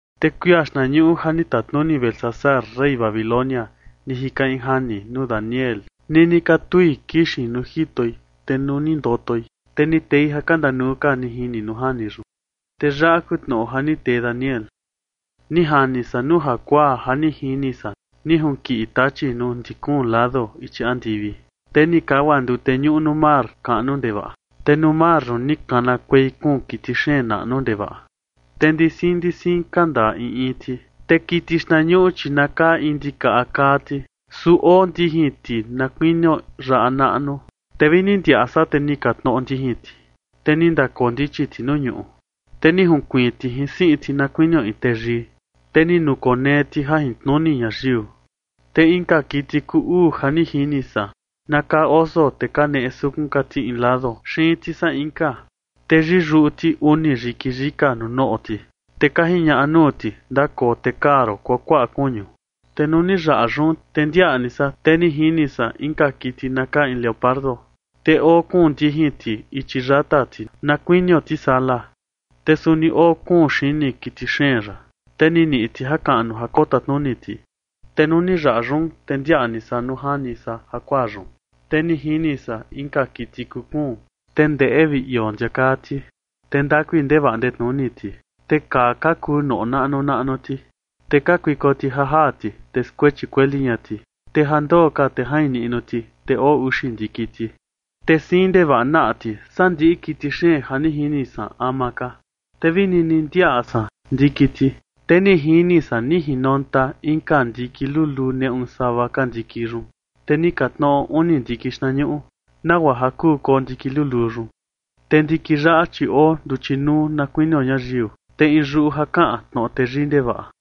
Te kuia xtnañuꞌu ja ni tatnuni Belsasar, rey Babilonia, ni jika in jani nuu Daniel nini katui kixin nuu jitoi. Te nuu ni ndotoi, te ni tei ja ka ndanuu ka ni jini nuu jani yun. Te yaꞌa kuu tnoꞌo ja ni tee Daniel: Ni jani san nuu jakuaa ja ni jini san ni junkiꞌi tachi nuu ndi kuun lado ichi andivi, te ni kagua ndute ñuꞌu nuu mar kaꞌnu ndevaꞌa. Te nuu mar yun ni kanakuei kuun kiti xeen naꞌnu ndevaꞌa, te ndi siin ndi siin ka ndaa in in ti. Te kiti xtnañuꞌu, chi na kaa in ndikaꞌa kaa ti, su oo ndijin ti na kuinio yaꞌa naꞌnu. Te vini ni ndiaꞌa san, te ni ka tnoꞌo ndijin ti, te ni ndakoo ndichi ti nuu ñuꞌu, te ni junkuiin ti jin siꞌin ti, na kuinio in teyii, te ni nukonee ti jajintnuni ñayiu. Te inka kiti kuu uu ja ni jini san na kaa oso, te kaneꞌe sukun ka ti in lado xiin ti saa inka, te yiyuꞌu ti uni yiki yika nuu noꞌo ti, te ka jiñaꞌa nuu ti: “Ndakoo te kaa ron kuakuaꞌa kuñu”. Te nuu ni yaꞌa yun, te ndiaꞌa ni san, te ni jini san inka kiti na kaa in leopardo, te oo kuun ndijin ti ichi yata ti na kuinio tisala. Te suni oo kuun xini kiti xeen yaꞌa, te ni niꞌi ti jakaꞌnu ja kotatnuni ti. Te nuu ni yaꞌa yun, te ndiaꞌa ni san nuu jani san jakuaa yun, te ni jini san inka kiti kuu kuun, te ndeꞌe vi ioo ndia kaa ti, te ndakui ndevaꞌa ndetnuni ti. Te kaa ka kuu noꞌo naꞌnu naꞌnu ti, te kakuiko ti ja jaa ti, te skuechi kueli ña ti, te ja ndoo ka te jain niꞌnu ti. Te oo uxi ndiki ti, te siin ndevaꞌa naꞌa ti saa ndiꞌi kiti xeen ja ni jini san ama ka. Te vi nini ndiaꞌa san ndiki ti, te ni jini san ni jinonta inka ndiki luluu neꞌu sava ka ndiki yun, te ni ka tnoꞌo uni ndiki xtnañuꞌu, nagua ja kuu koo ndiki luluu yun. Te ndiki yaꞌa, chi oo nduchi nuu na kuinio ñayiu, te in yuꞌu ja kaꞌan tnoꞌo teyii ndevaꞌa.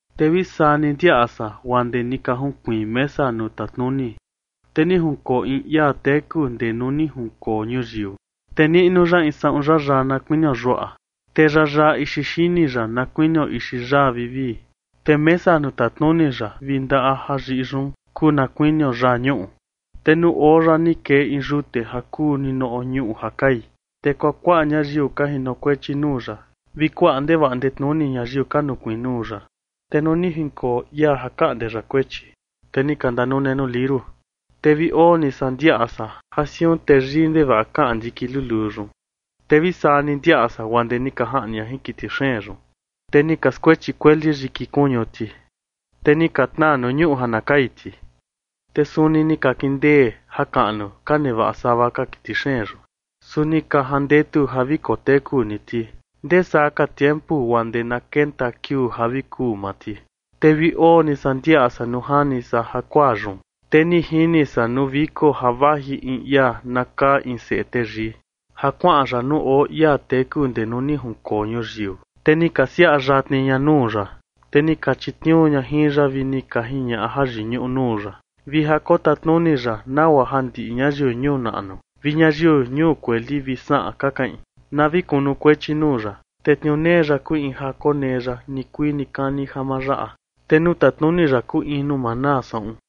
Te vi saa ni ndiaꞌa san guaa ndee ni ka junkuiin mesa nuu tatnuni, te ni junkoo in ia teku ndee nuu ni jinkoo ñuyiu, te niꞌnu ya in saꞌun yayaa na kuinio yuaꞌa. Te yayaa ixi xini ya na kuinio ixi yaa vivii, te mesa nuu tatnuni ya vi ndaꞌa ja yiꞌi yun kuu na kuinio yaa ñuꞌu. Te nuu oo ya ni kee in yute ja kuu ninoꞌo ñuꞌu ja kai, te kuakuaꞌa ñayiu ka jinokuechi nuu ya vi kuaꞌa ndevaꞌa ndetnuni ñayiu ka nukuiin nuu ya. Te nuu ni jinkoo ia ja kaꞌnde ya kuechi, te ni ka ndanune nuu liuru. Te vi oo ni san ndiaꞌa san ja siun teyii ndevaꞌa kaꞌan ndiki luluu yun, te vi saa ni ndiaꞌa san guaa ndee ni ka jaꞌni ña jin kiti xeen yun, te ni ka skuechi kueli yiki kuñu ti, te ni ka tnaa nuu ñuꞌu ja na kai ti. Te suni ni ka kindee jakaꞌnu ka nevaꞌa sava ka kiti xeen yun. Su ni ka jandetu ja vi koteku ni ti ndesaa ka tiempu guaa ndee na kenta kiuu ja vi kuu maa ti. Te vi oo ni san ndiaꞌa san nuu jani san jakuaa yun, te ni jini san nuu viko ja vaji in ia na kaa in seꞌe teyii ja kuaꞌan ya nuu oo ia teku ndee nuu ni jinkoo ñuyiu, te ni ka siaꞌa yatni ña nuu ya. Te ni ka chitniuu ña jin ya vi ni ka jiñaꞌa jayiñuꞌu nuu ya, vi ja kotatnuni ya, nagua ja ndiꞌi ñayiu ñuu naꞌnu vi ñuu kueli vi saꞌan ka kaꞌin, na vi kunukuechi nuu ya. Te tniuu nee ya kuu in ja konee ya nikuii nikani ja ma yaꞌa, te nuu tatnuni ya kuu in nuu ma naa saꞌun.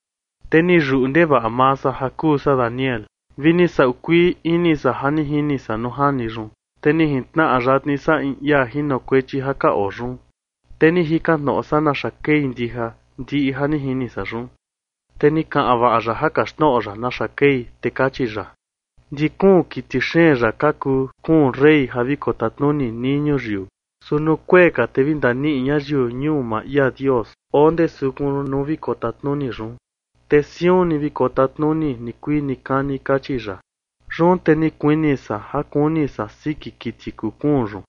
Te ni yuꞌu ndevaꞌa maa san ja kuu san Daniel, vi ni sau kuii ini san jin ja ni jini san nuu jani yun. Te ni jintnaꞌa yatni san in ia jinokuechi ja ka oo yun, te ni jikan tnoꞌo san naxa kei ndija ndiꞌi ja ni jini san yun. Te ni kaꞌan vaꞌa ya ja kaxtnoꞌo ya naxa kei, te kachi ya: ―Ndi kuun kiti xeen yaꞌa ka kuu kuun rey ja vi kotatnuni nii ñuyiu. Su nuu kuee ka, te vi ndaniꞌi ñayiu ñuu maa ia Dios oo ndee sukun nuu vi kotatnuni yun, te siun ni vi kotatnuni nikuii nikani ―kachi ya. Yun te ni kuini san ja kuni san siki kiti kuu kuun yun,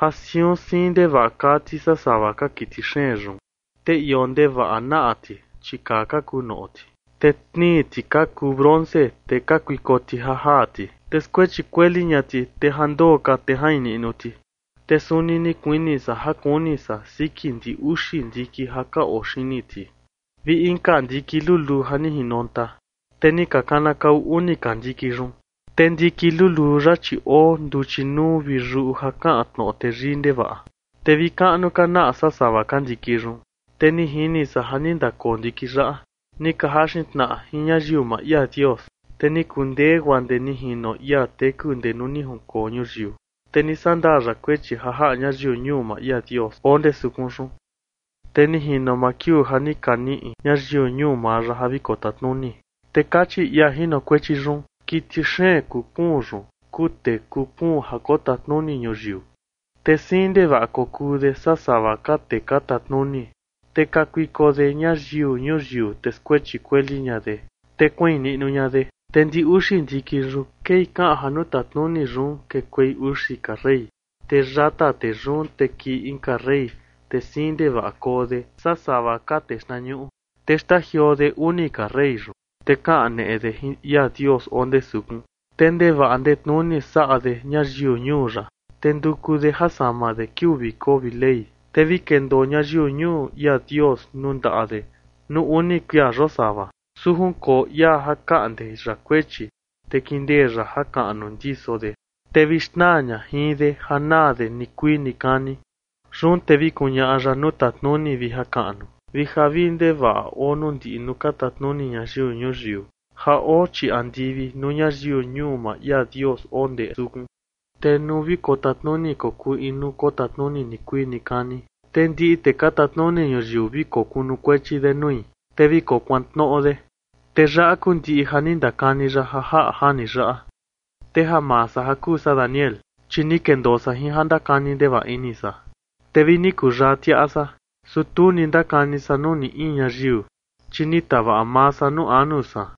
ja siun siin ndevaꞌa kaa ti saa sava ka kiti xeen yun, te ioo ndevaꞌa naꞌa ti, chi kaa ka kuu noꞌo ti, te tnii ti ka kuu bronce, te kakuiko ti ja jaa ti, te skuechi kueli ña ti, te ja ndoo ka, te jain niꞌnu ti. Te suni ni kuini san ja kuni san siki ndi uxi ndiki ja ka oo xini ti, vi inka ndiki luluu ja ni jinonta, te ni ka kanakau uni ka ndiki yun. Te ndiki luluu yaꞌa, chi oo nduchi nuu vi yuꞌu ja kaꞌan tnoꞌo teyii ndevaꞌa, te vi kaꞌnu ka naꞌa saa sava ka ndiki yun. Te ni jini san ja ni ndakoo ndiki yaꞌa ni ka jaxin tnaꞌa jin ñayiu maa ia Dios, te ni kundee, guaa ndee ni jino ia teku ndee nuu ni jinkoo ñuyiu. Te ni sandaa ya kuechi ja jaꞌa ñayiu ñuu maa ia Dios oo ndee sukun yun. Te ni jino maa kiuu ja ni ka niꞌi ñayiu ñuu maa ya ja vi kotatnuni. Te kachi ia jinokuechi yun: Kiti xeen kuu kuun yun kuu tee kuu kuun ja kotatnuni ñuyiu, te siin ndevaꞌa kokuu de saa sava ka tee ka tatnuni, te kakuiko de ñayiu ñuyiu, te skuechi kueli ña de, te kuain niꞌnu ña de. Te ndi uxi ndiki yun kei kaꞌan ja nuu tatnuni yun kekuei uxi ka rey. Te yata tee yun te kii inka rey, te siin ndevaꞌa koo de saa sava ka tee xtnañuꞌu, te xtajioo de uni ka rey yun. Te kaneꞌe de jin ia Dios oo ndee sukun te ndevaꞌa ndetnuni saꞌa de ñayiu ñuu ya, te nduku de ja sama de kiuu viko vi Ley, te vi kendoo ñayiu ñuu ia Dios nuu ndaꞌa de nuu uni kuia yosava. Su junkoo ia ja kaꞌnde ya kuechi, te kindee ya jakaꞌnu ndiso de, te vi xnaa ña jin de ja naa de nikuii nikani. Yun te vi kuñaꞌa ya nuu tatnuni vi jakaꞌnu vi javii ndevaꞌa oo ndiꞌi nuu ka tatnuni ñayiu ñuyiu ja oo chii andivi, nuu ñayiu ñuu maa ia Dios oo ndee sukun. Te nuu vi kotatnuni kokuu in nuu kotatnuni nikuii nikani, te ndiꞌi tee ka tatnuni ñuyiu vi kokunukuechi de nui, te vi kokuantnoꞌo de. Te yaꞌa kuu ndiꞌi ja ni ndakani ya ja jaꞌa jani yaꞌa. Te ja maa san ja kuu san Daniel, chi ni kendoo san jin ja ndakani ndevaꞌa ini san, te vi ni kuyaa tiaꞌa san. Su tu ni ndakani san nuu ni in ñayiu, chi ni tavaꞌa maa san nuu anu san.